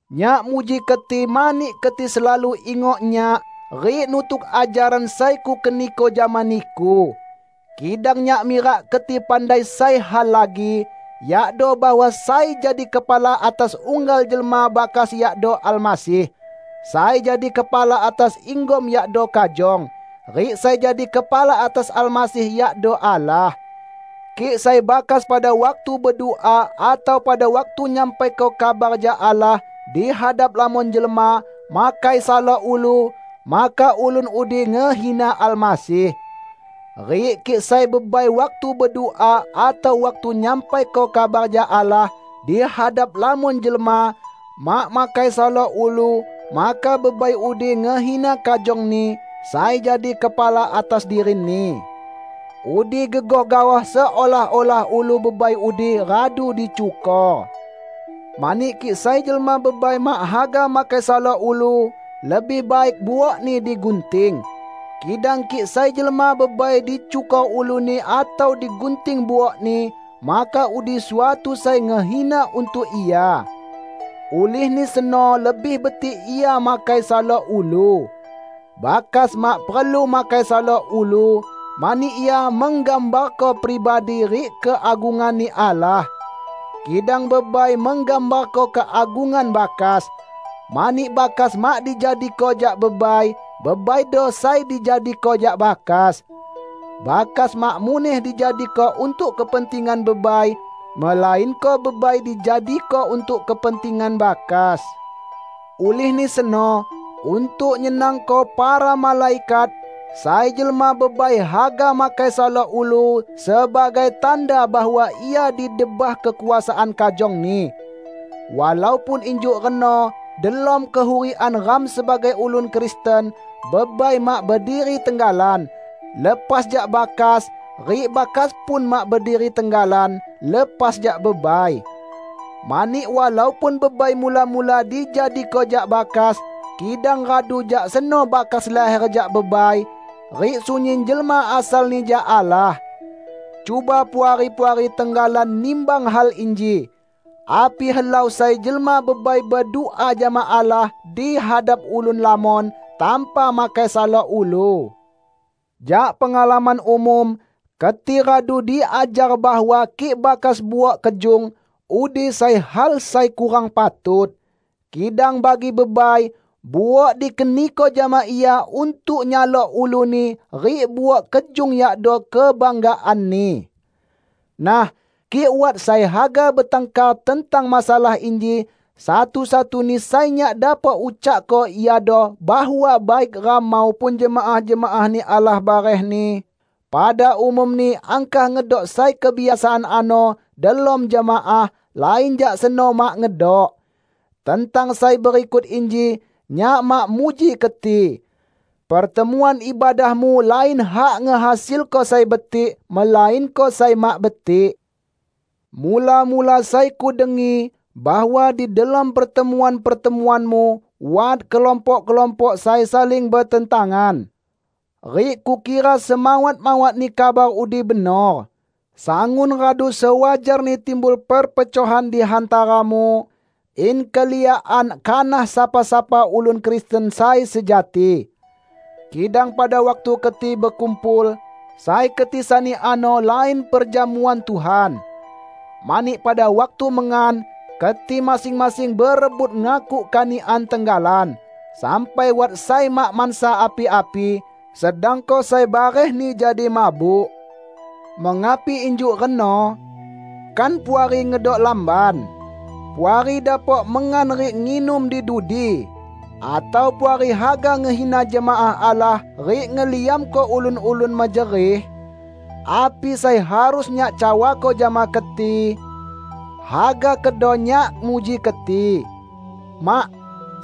Nyak muji keti mani keti selalu ingok nyak rik nutuk ajaran sai kukeniko jama niku. Kidang nyak mirak keti pandai sai hal lagi, yakdo bahwa sai jadi kepala atas unggal jelma bakas yakdo Almasih; sai jadi kepala atas inggom yakdo kajong, rik sai jadi kepala atas Almasih yakdo Allah. Kik sai bakas pada waktu bedua atau pada waktu nyampaiko kabar jak Allah di hadap lamon jelma, makai salok ulu, maka ulun udi ngehina Almasih. Rik kik sai bebai waktu bedua atau waktu nyampaiko kabar jak Allah di hadap lamon jelma, mak makai salok ulu, maka bebai udi ngehina kajongni sai jadi kepala atas dirini. Udi gegoh gaoh seolah-olah ulu bebai udi radu dicukor. Mani kik sai jelma bebai mak haga makai salok ulu lebih baik buokni digunting. Kidang kik sai jelma bebai dicukor uluni atau digunting buokni, maka udi suatu sai ngehina untuk ia. Ulihni seno lebih betik ia makai salok ulu. Bakas mak perlu makai salok ulu, mani ia menggambarko pribadi rik keagungan-Ni Allah. Kidang bebai menggambarko keagungan bakas, mani bakas mak dijadiko jak bebai, bebaido sai dijadiko jak bakas. Bakas mak muneh dijadiko untuk kepentingan bebai, melainko bebai dijadiko untuk kepentingan bakas. Ulihni seno, untuk nyenangko para malaikat, sai jelma bebai haga makai salok ulu sebagai tanda bahwa ia di debah kekuasaan kajongni. Walaupun injuk reno delom kehurikan ram sebagai ulun Kristen, bebai mak berdiri tenggalan, lepas jak bakas, rik bakas pun mak berdiri tenggalan, lepas jak bebai. Mani walaupun bebai mula-mula dijadiko jak bakas, kidang radu jak seno bakas laher jak bebai; rik sunyin jelma asalni jak Allah. Cuba Puari-puari tenggalan nimbang hal inji: Api helau sai jelma bebai bedua jama Allah di hadap ulun lamon, tanpa makai salok ulu? Jak pengalaman umum, keti radu diajar bahwa kik bakas buok kejung, udi sai hal sai kurang patut. Kidang bagi bebai, buok dikeniko jama ia untuk nyalok uluni rik buok kejung yakdo kebanggaanni. Nah, kik wat sai haga betangkar tentang masalah inji, satu-satuni sai nyak dapok ucakko iado bahwa baik ram maupun jemaah-jemaah-Ni Allah barehni, pada umumni angkah ngedok sai kebiasaan ano delom jemaah; lain jak seno mak ngedok. Tentang sai berikut inji, nyak mak muji keti. Pertemuan ibadahmu lain hak ngehasilko sai betik, melainko sai mak betik. Mula-mula sai kudengi, bahwa di delom pertemuan-pertemuanmu wat kelompok-kelompok sai saling betentangan. Rik kukira semawat-mawatni kabar udi benor. Sangun radu sewajarni timbul perpecohan di hantaramu, in keliakan kanah sapa-sapa ulun Kristen sai sejati. Kidang pada waktu keti bekumpul, sai keti sani ano lain Perjamuan Tuhan. Mani pada waktu mengan, keti masing-masing berebut ngakuk kanikan tenggalan, sampai wat sai mak mansa api-api, sedangko sai barehni jadi mabuk. Mengapi injuk reno? Kan puari ngedok lamban? Puari dapok mengan rik nginum di dudi! Atau Puari haga ngehina jemaah Allah rik ngeliamko ulun-ulun mejerih? Api sai harus nyak cawako jama keti? Haga kedo nyak muji keti? Mak!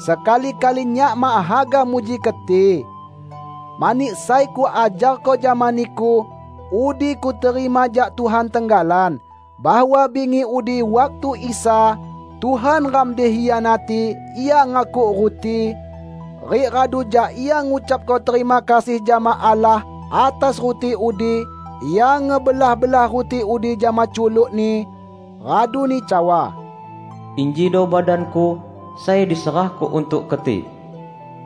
Sekali-kali nyak mak haga muji keti. Mani sai kuajarko jama niku, udi kuterima jak Tuhan tenggalan: bahwa bingi udi waktu Isa, Tuhan ram dikhianati, Ia ngakuk ruti, rik radu jak Ia ngucapko terima kasih jama Allah atas ruti udi, Ia ngebelah-belah ruti udi jama culuk-Ni, raduni cawa, "Injido badan-Ku sai diserahko untuk keti.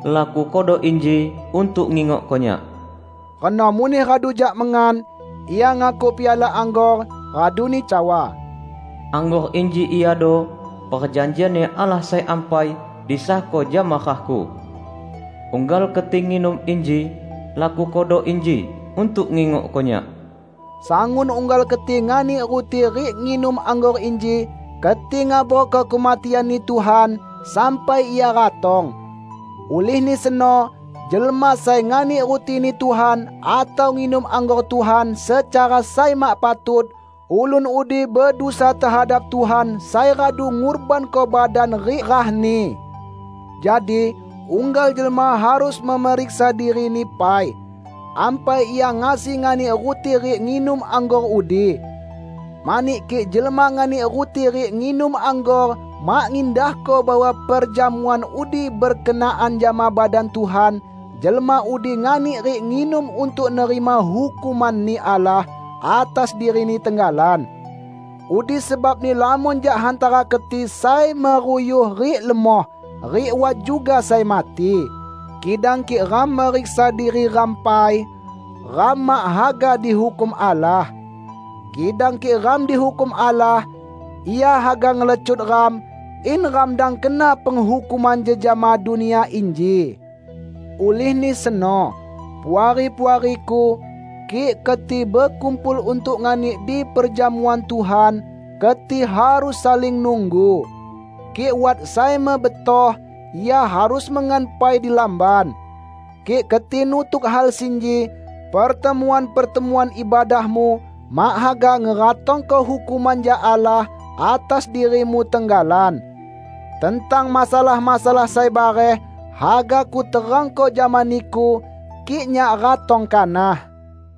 Lakukodo inji untuk ngingokko Nyak." Reno muneh radu jak mengan, Ia ngakuk piala anggor raduni cawa, "Anggor inji iado perjanjian-Ni Allah sai ampai, disahko jama rah-Ku. Unggal keti nginum inji, lakukodo inji untuk ngingokko Nyak." Sangun unggal keti nganik ruti rik nginum anggor inji, keti ngabarko kematian-Ni Tuhan, sampai Ia ratong. Ulihni seno, jelma sai nganik ruti-Ni Tuhan atau nginum anggor Tuhan secara sai mak patut, ulun udi bedusa tehadap Tuhan sai radu ngurbanko badan rik rah-Ni. Jadi, unggal jelma harus meriksa dirini pai, ampai ia ngasi nganik ruti rik nginum anggor udi. Mani kik jelma nganik ruti rik nginum anggor mak ngindahko bahwa perjamuan udi berkenaan jama badan Tuhan, jelma udi nganik rik nginum untuk nerima hukuman-Ni Allah atas dirini tenggalan. Udi sebabni lamon jak hantara keti sai meruyuh rik lemoh, rik wat juga sai mati. Kidang kik ram meriksa diri ram pai, ram mak haga dihukum Allah. Kidang kik ram dihukum Allah, Ia haga ngelecut ram, in ram dang kena penghukuman jejama dunia inji. Ulihni seno, Puari-puariku, kik keti bekumpul untuk nganik di perjamuan Tuhan, keti harus saling nunggu. Kik wat sai mebetoh, ia harus mengan pai di lamban. Kik keti nutuk hal sinji, pertemuan-pertemuan ibadahmu mak haga ngeratongko hukuman jak Allah atas dirimu tenggalan. Tentang masalah-masalah sai bareh, haga kuterangko jama niku, kik nyak ratong kanah.